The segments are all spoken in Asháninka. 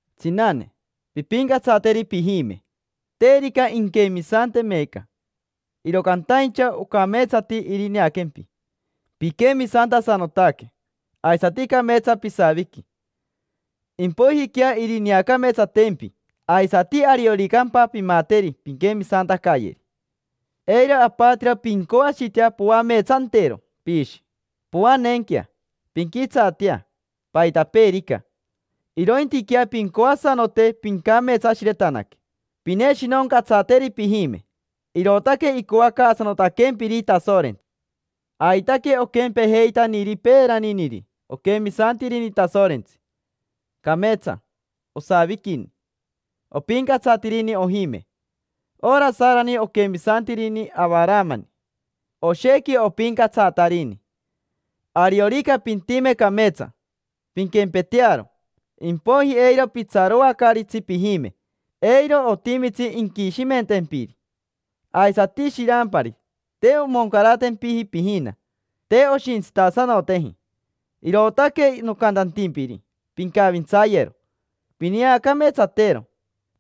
Tsinane, pimpincatsateri pijime. Terica inquemisante meeca, iro cantaincha ocameetsati irineaquempi piquemisantasanotaque aisati cameetsa pisaviqui. Impoijiquea irineacameetsatempi, aisati arioricampa pimateri pinquemisantacayeri. Eiro apatiro pincoashitea poameetsantero piishi, poaneenquea, pinquitsaatea, paitapeerica. Irointiquea pincoasanote pincameetsashiretanaque, pineshinoncatsateri pijime. Irootaque icoacaasanotaquempiri Tasorentsi. Aitaque oquempejeitaniri peeraniniri quemisantiriri Tasorentsi: cameetsa osaviquini, opincatsatirini ojime. Ora Sarani oquemisantirini Avaramani, oshequi opincatsatarini. Ariorica pintime cameetsa, pinquempetearo, impoiji eiro pitsaroacaaritsi pijime: eiro otimitsi inquishimentempiri. Aisati shirampari: te omoncaratempiji pijina, te oshintsitasanoteji, irootaque nocantantimpiri pincavintsayero, pineacameetsatero.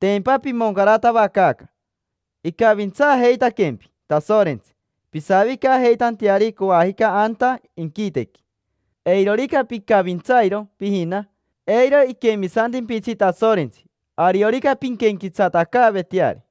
Tempa pimoncaratavacaaca, icavintsaajeitaquempi Tasorentsi pisavicajeitanteari coajica anta inquitequi. Eirorica picavintsairo pijina, eiro iquemisantimpitsi Tasorentsi ariorica pinquenquetsatacaaveteari.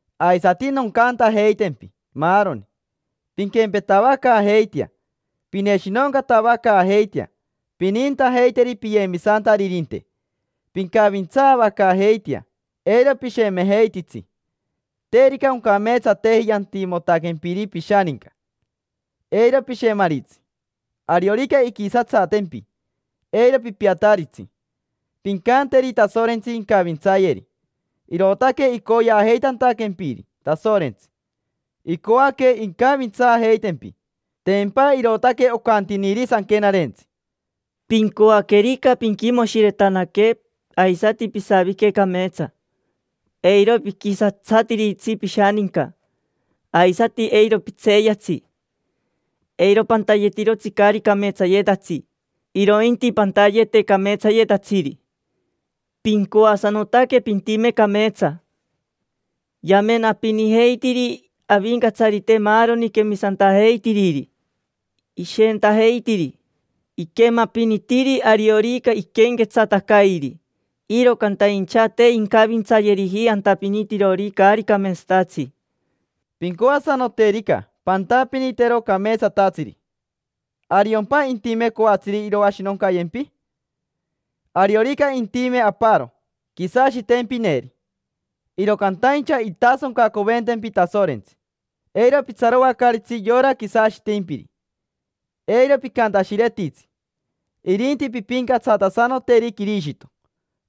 Aisati noncantajeitempi maaroni: pinquempetavacaajeitea, pineshinoncatavacaajeitea, pinintajeiteri piyemisantaririnte, pincavintsaavacaajeitea, eiro pishemejeititsi. Terica oncameetsateji yantimotaquempiri pishaninca, eiro pishemaritsi; ariorica inquisatsatempi, eiro pipiataritsi. Pincanteri Tasorentsi incavintsayeri. Irootaque icoyeajeitantaquempiri Tasorentsi: icoaque incavintsaajeitempi. Tempa irootaque ocantiniri Sanquenarentsi: “Pincoaquerica pinquimoshiretanaque aisati pisavique cameetsa, eiro piquisatsatiritsi pishaninca, aisati eiro pitseeyatsi. Eiro pantayetirotsi caari cameetsayetatsi, irointi pantayete cameetsayetatsiri. Pincoasanotaque pintime cameetsa. Yamenapinijeitiri Avincatsarite maaroni quemisantajeitiriri, ishentajeitiri. Iquemapinitiri ariorica iquenquetsatacairi. Iro cantaincha te incavintsayeriji antapinitirori caari cameetsatatsi”. Pincoasanoterica pantapinitero cameetsatatsiri, ¿ariompa intime coatsiri iroashinoncayempi? Ariorica intime aparo quisashitempineri, iro cantaincha intasoncacoventempi Tasorentsi. Eiro pitsaroacaaritsi yora quisashitimpiri, eiro picantashiretitsi, irinti pimpincatsatasanoteri Quirishito.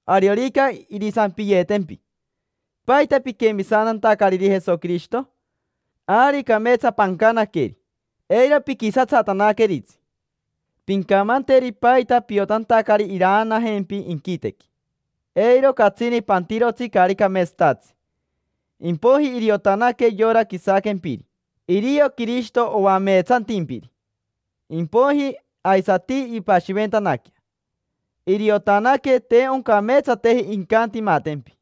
Ariorica irisampiyeetempi: “¿Paita piquemisantantacariri Jesoquirishito?” Ari cameetsa pancanaqueri, eiro piquisatsatanaqueritsi. Pincamanteri paita piotantacari iraanajempi inquitequi. Eiro catsini pantirotsi caari cameetsatatsi. Impoiji iriotanaque yora quisaquempiri irio Quirishito oameetsantimpiri. Impoiji aisati impashiventanaquea, iriotanaque te oncameetsateji incantimatempi.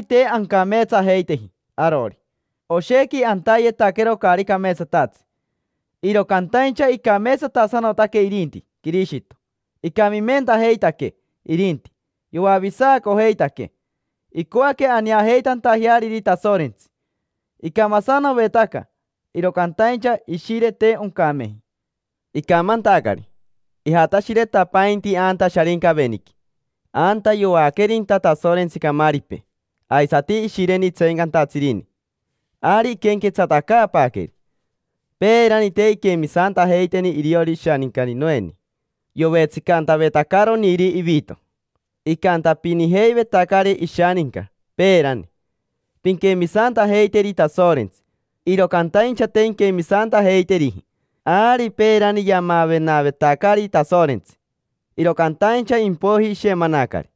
Ari te ancameetsajeiteji arori, oshequi antayetaquero caari cameetsatatsi, iro cantaincha icameetsatasanotaque irinti Quirishito. Icamimentajeitaquee irinti, yoavisacojeitaquee; icoaque aneajeitantajeariri Tasorentsi. Icamasanovetaca; iro cantaincha ishire, te oncameji. Icamantacari, ijashiretapainti anta Sharincaveniqui, anta yoaquerinta Tasorentsi camaaripee aisati ishireni tseencantatsiniri. Ari iquenquetsatacaapaaqueri. Peerani, te inquemisantajeiteni iriori ishaninca Noeni. Yovetsicantavetacaroniri ivito, icantapinijeivetacari ishaninca peerani: “Pinquemisantajeiteri Tasorentsi”, iro cantaincha te inquemisantajeiteriji. Ari peerani yamavenavetacari Tasorentsi, iro cantaincha impoiji ishemanacari,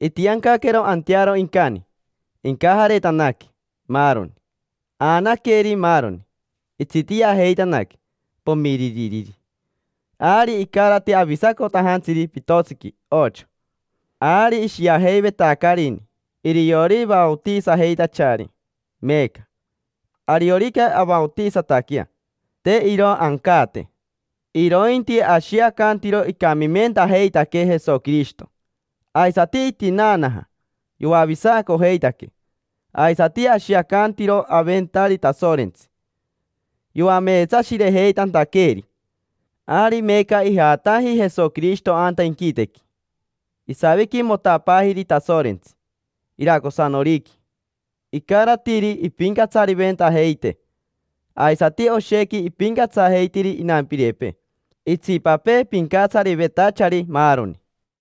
itiancaquero antearo incani, incajaretanaque, maaroni. Aanaqueri maaroni, itsitiajeitanaque, pomiririri. Ari icarati avisacotajantsiri pitotsiqui ocho. Ari ishiajeivetacarini iriori vaotisajeitachari meeca. Ariorica avaotisataquea, te iro ancaate, irointi ashiacantiro icamimentajeitaquee Jesoquirishito, aisati itinaanaja, yoavisacojeitaquee. Aisati ashiacantiro aventari Tasorentsi yoameetsashirejeitantaqueeri. Ari meeca ijataji Jesoquirishito anta inquitequi, isaviquimotapaajiri Tasorentsi iracosanoriqui: icaratiri ipincatsariventajeitee. Aisati oshequi ipincatsajeitiri inampirepee, itsipapee pincatsarivetachari, maaroni.